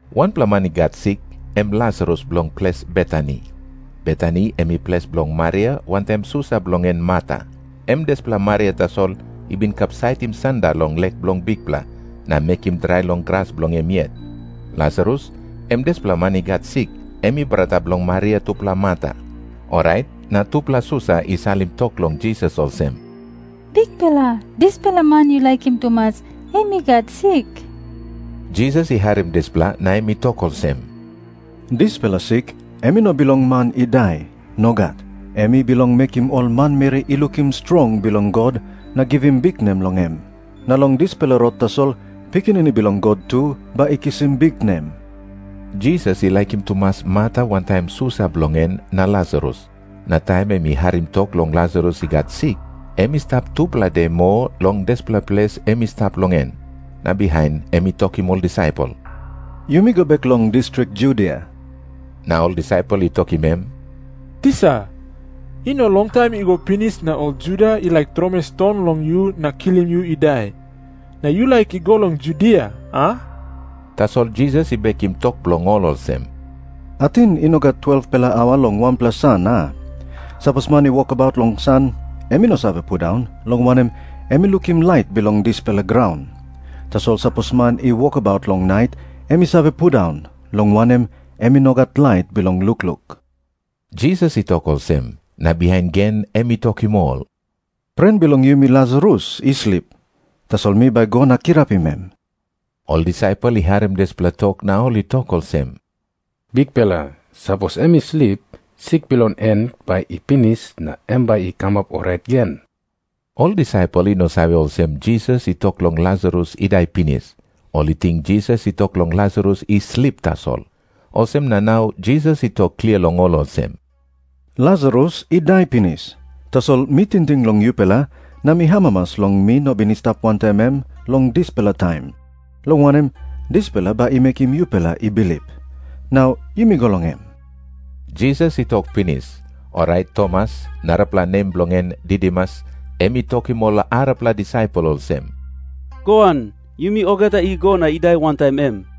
Wanpela man i gat sik, em Lasarus bilong ples Betani. Betani em i ples bilong Maria wantaim susa bilong en Marta. Em dispela Maria tasol i bin kapsaitim sanda long lek bilong Bikpela, na mekim drai long gras bilong em yet. Lasarus, em dispela man i gat sik, em i brata bilong Maria tupela Marta. Orait na tupela susa i salim tok long Jisas olsem, "Bikpela, dispela man yu laikim tumas, em i gat sik." Jisas i harim dispela na em i tok olsem, "Dispela sik em I no bilong man i dai. Nogat. Em i bilong mekim ol manmeri i lukim strong bilong God na givim biknem long em. Na long dispela rot tasol Pikinini Bilong God tu bai i kisim biknem." Jisas i laikim tumas Marta wantaim susa bilong en na Lasarus. Na taim em i harim tok long Lasarus i gat sik, em i stap tupela de moa long dispela ples em i stap long en. Na bihain em i tokim ol disaipel, "Yumi go bek long distrik Judia." Na ol disaipel i tokim em, "Tisa, i no longtaim i go pinis na ol Juda i laik tromoi ston long yu na kilim yu i dai. Na yu laik i go long Judia, a?" Tasol Jisas i bekim tok bilong ol olsem, "Ating i no gat 12-pela aua long wanpela san, a? Sapos man i wokabaut long san, em i no save pundaun, long wanem, em i lukim lait bilong dispela graun. Tasol sapos man i wokabaut long nait, em i save pundaun, long wanem, em i no gat lait bilong lukluk." Jisas i tok olsem, na bihain gen em i tokim ol, "Pren bilong yumi Lasarus i slip. Tasol mi bai go na kirapim em." Ol disaipel i harim dispela tok na ol i tok olsem, "Bikpela, sapos em i slip, sik bilong en bai i pinis na em bai i kamap orait gen." Ol disaipel i no save olsem Jisas i tok long Lasarus i dai pinis. Ol i ting Jisas I tok long Lasarus i slip tasol. Olsem na nau Jisas i tok klia long ol olsem, "Lasarus i dai pinis. Tasol mi tingting long yupela na mi amamas long mi no bin i stap wantaim em long dispela taim. Long wanem, dispela bai i mekim yupela i bilip. Nau yumi go long em." Jisas i tok pinis, orait Tomas, narapela nem bilong en Didimus, em i tokim ol arapela disaipel olsem, "Goan, yumi olgeta i go na i dai wantaim em."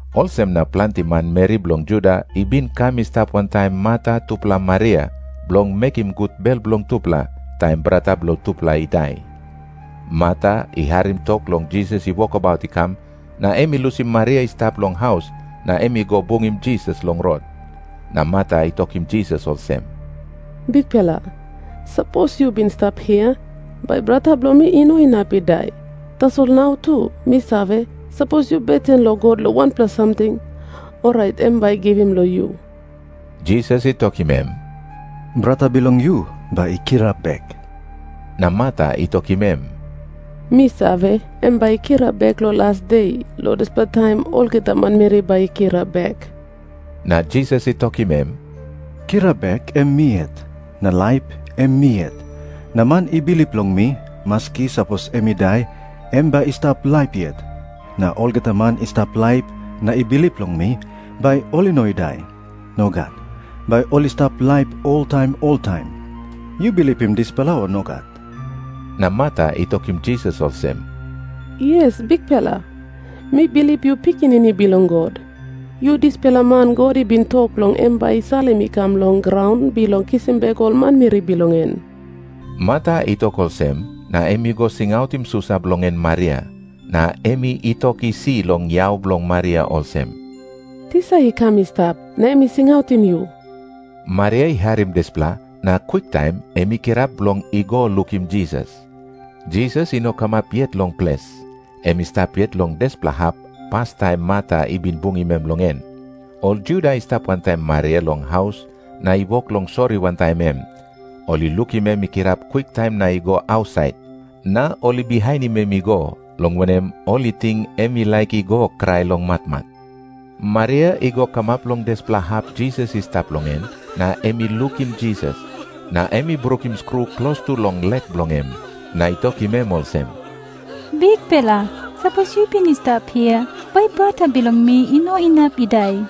olsem na planti manmeri bilong Juda i bin kam i stap wantaim Marta tupela Maria, bilong mekim gut bel bilong tupela, taim brata bilong tupela i dai. Marta i harim tok long Jisas i wokabaut i kam, na em i lusim Maria i stap long haus na em i go bungim Jisas long rot. Na Marta i tokim Jisas olsem, "Bikpela, sapos yu bin i stap hia, bai brata bilong mi i no inap i dai. Tasol nau tu mi save, sapos yu beten long God long wanpela samting, orait em bai i givim long yu." Jisas i tokim em, "Brata bilong yu bai i kirap bek." Na Marta i tokim em, "Mi save, em bai i kirap bek long las de, long dispela taim olgeta manmeri bai i kirap bek." Na Jisas i tokim em, "Kirap bek, em mi yet. Na laip, em mi yet. Na man i bilip long mi, maski sapos em i dai, em bai i stap laip yet. Na olgeta man i stap laip na i bilip long mi, bai ol i no i dai. Nogat. Bai ol i stap laip oltaim oltaim. Yu bilipim dispela, o nogat?" Na Marta i tokim Jisas olsem, "Yes, Bikpela. Mi bilip yu Pikinini Bilong God. Yu dispela man God i bin tok long em bai i salim i kam long graun bilong kisim bek ol manmeri bilong en." Marta i tok olsem, na em i go singautim susa bilong en Maria. Na em i i tok isi long yau bilong Maria olsem, "Tisa i kam I stap, na em i singautim yu." Maria i harim dispela, na kwiktaim em i kirap bilong i go lukim Jisas. Jisas i no kamap yet long ples. Em i stap yet long dispela hap, pastaim Marta i bin bungim em long en. Ol Juda i stap wantaim Maria long haus na i wok long sori wantaim em, ol i lukim em i kirap kwiktaim na i go ausait. Na ol i bihainim em i go, long wanem, ol i ting em i laik i go krai long matmat. Maria i go kamap long dispela hap Jisas i stap long en, na em i lukim Jisas. Na em i brukim skru klostu long lek bilong em, na i tokim em olsem, "Bikpela, sapos yu bin i stap hia, bai brata bilong mi i no inap i dai."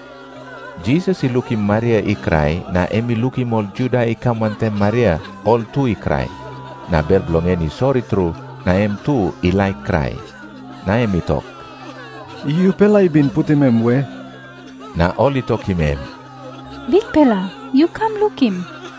Jisas i lukim Maria i krai, na em i lukim ol Juda i kam wantaim Maria, ol tu i krai. Na bel bilong en i sori tru na em tu i laik krai. Na em i tok, "Yupela i bin putim em we?" Na ol I tokim em, "Bikpela, yu kam lukim."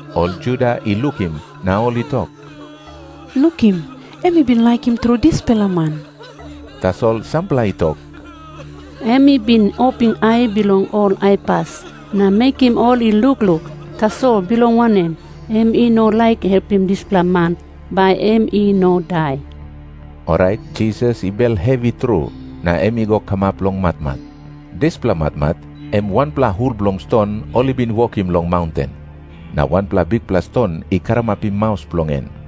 Ol Juda i lukim na ol i tok, "Lukim. Em i bin laikim tru dispela man." Tasol sampela i tok, "Em i bin opim ai bilong ol aipas na mekim ol i lukluk. Tasol bilong wanem em i no laik helpim dispela man bai em i no dai?" Orait Jisas i bel hevi tru, na em i go kamap long matmat. Dispela matmat em wanpela hul bilong ston ol i bin wokim long maunten. Na wanpela bikpela ston i karamapim maus bilong en.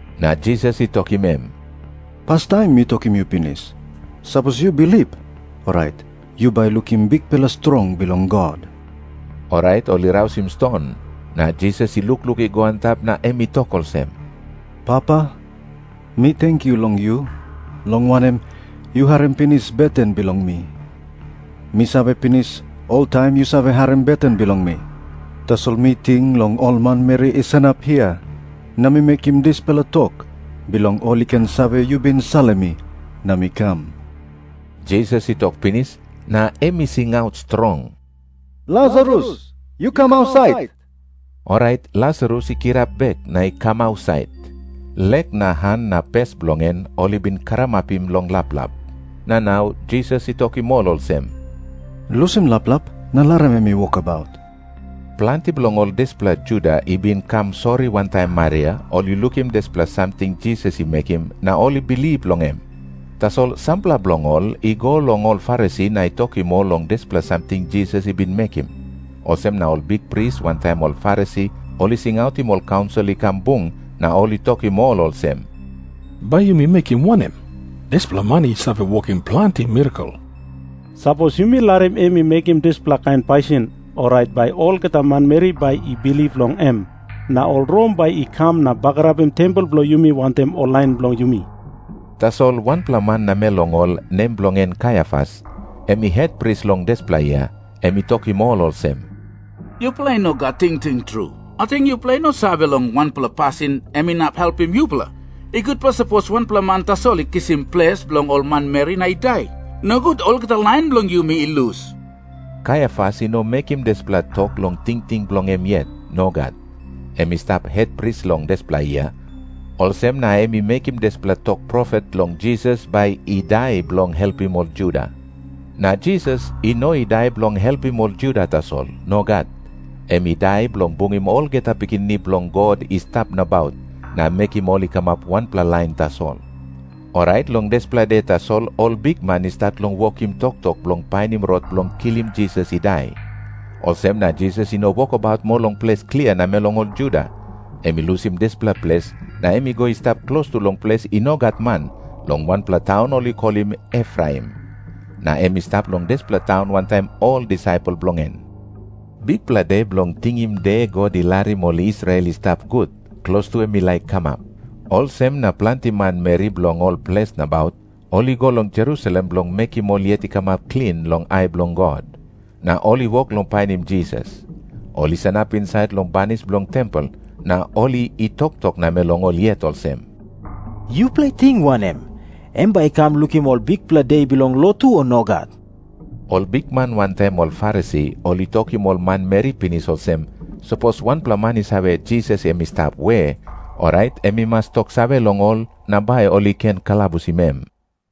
Na Jisas i tokim em, "Pastaim mi tokim yu pinis, sapos yu bilip, orait yu bai lukim bikpela strong bilong God." Orait ol i rausim ston. Na Jisas i lukluk i go antap na em i tok olsem, "Papa, mi tenkyu long yu, long wanem, yu harim pinis beten bilong mi. Mi save pinis oltaim yu save harim beten bilong mi. Tasol mi ting long ol manmeri i sanap hia na mi mekim dispela tok, bilong ol i ken save yu bin salim mi na mi kam." Jisas i tok pinis, na em i singaut strong, "Lasarus, yu kam ausait." Orait Lasarus i kirap bek na i kam ausait. Lek na han na pes bilong en ol i bin karamapim long laplap. Na nau Jisas i tokim ol olsem, "Lusim laplap na larim em i wokabaut." Planti bilong ol dispela Juda i bin kam sori wantaim Maria, ol i lukim dispela samting Jisas i mekim, na ol i bilip long em. Tasol sampela bilong ol i go long ol Farisi na i tokim ol long dispela samting Jisas i bin mekim. Olsem na ol bikpris wantaim ol Farisi ol i singautim ol kaunsil i kam bung na ol i tokim ol olsem, "Bai yumi mekim wanem? Dispela man i save wokim planti mirakel. Sapos yumi larim em i mekim dispela kain pasin, orait bai olgeta manmeri bai i bilip long em. Na ol Rom bai i kam na bagarapim tempel bilong yumi wantaim ol lain bilong yumi." Tasol wanpela man namel long ol, nem bilong en Kaiafas, em i hetpris long dispela yia, em i tokim ol olsem, "Yupela i no gat tingting tru. Ating yupela i no save long wanpela pasin em inap helpim yupela. I gutpela sapos wanpela man tasol i kisim ples bilong ol manmeri na i dai, nogut olgeta lain bilong yumi i lus." Kaiafas i no mekim dispela tok long tingting bilong em yet. Nogat. Em i stap hetpris long dispela yia, olsem na em i mekim dispela tok profet long Jisas bai i dai bilong helpim ol Juda. Na Jisas i no i dai bilong helpim ol Juda tasol. Nogat. Em i dai bilong bungim olgeta pikinini bilong God i stap nabaut, na mekim ol i kamap wanpela lain tasol. Orait long dispela de tasol ol bikman i stat long wokim toktok bilong painim rot bilong kilim Jisas i dai. Olsem na Jisas i no wokabaut moa long ples klia namel long ol Juda. Em i lusim dispela ples na em i go i stap klostu long ples i no gat man, long wanpela taun ol i kolim Efraim. Na em i stap long dispela taun wantaim ol disaipel bilong en. Bikpela De Bilong Tingim De God I Larim Ol Israel I Stap Gut, klostu em i laik kamap. Olsem na planti manmeri bilong ol ples nabaut ol i go long Jerusalem bilong mekim ol yet i kamap klin long ai bilong God. Na ol i wok long painim Jisas. Ol i sanap insait long banis bilong tempel na ol i i toktok namel long ol yet olsem, "Yupela i ting wanem? Em bai i kam lukim ol bikpela de bilong lotu, o nogat?" Ol bikman wantaim ol Farisi ol i tokim ol manmeri pinis olsem, sapos wanpela man i save Jisas em i stap we, orait em i mas toksave long ol na bai ol i ken kalabusim em.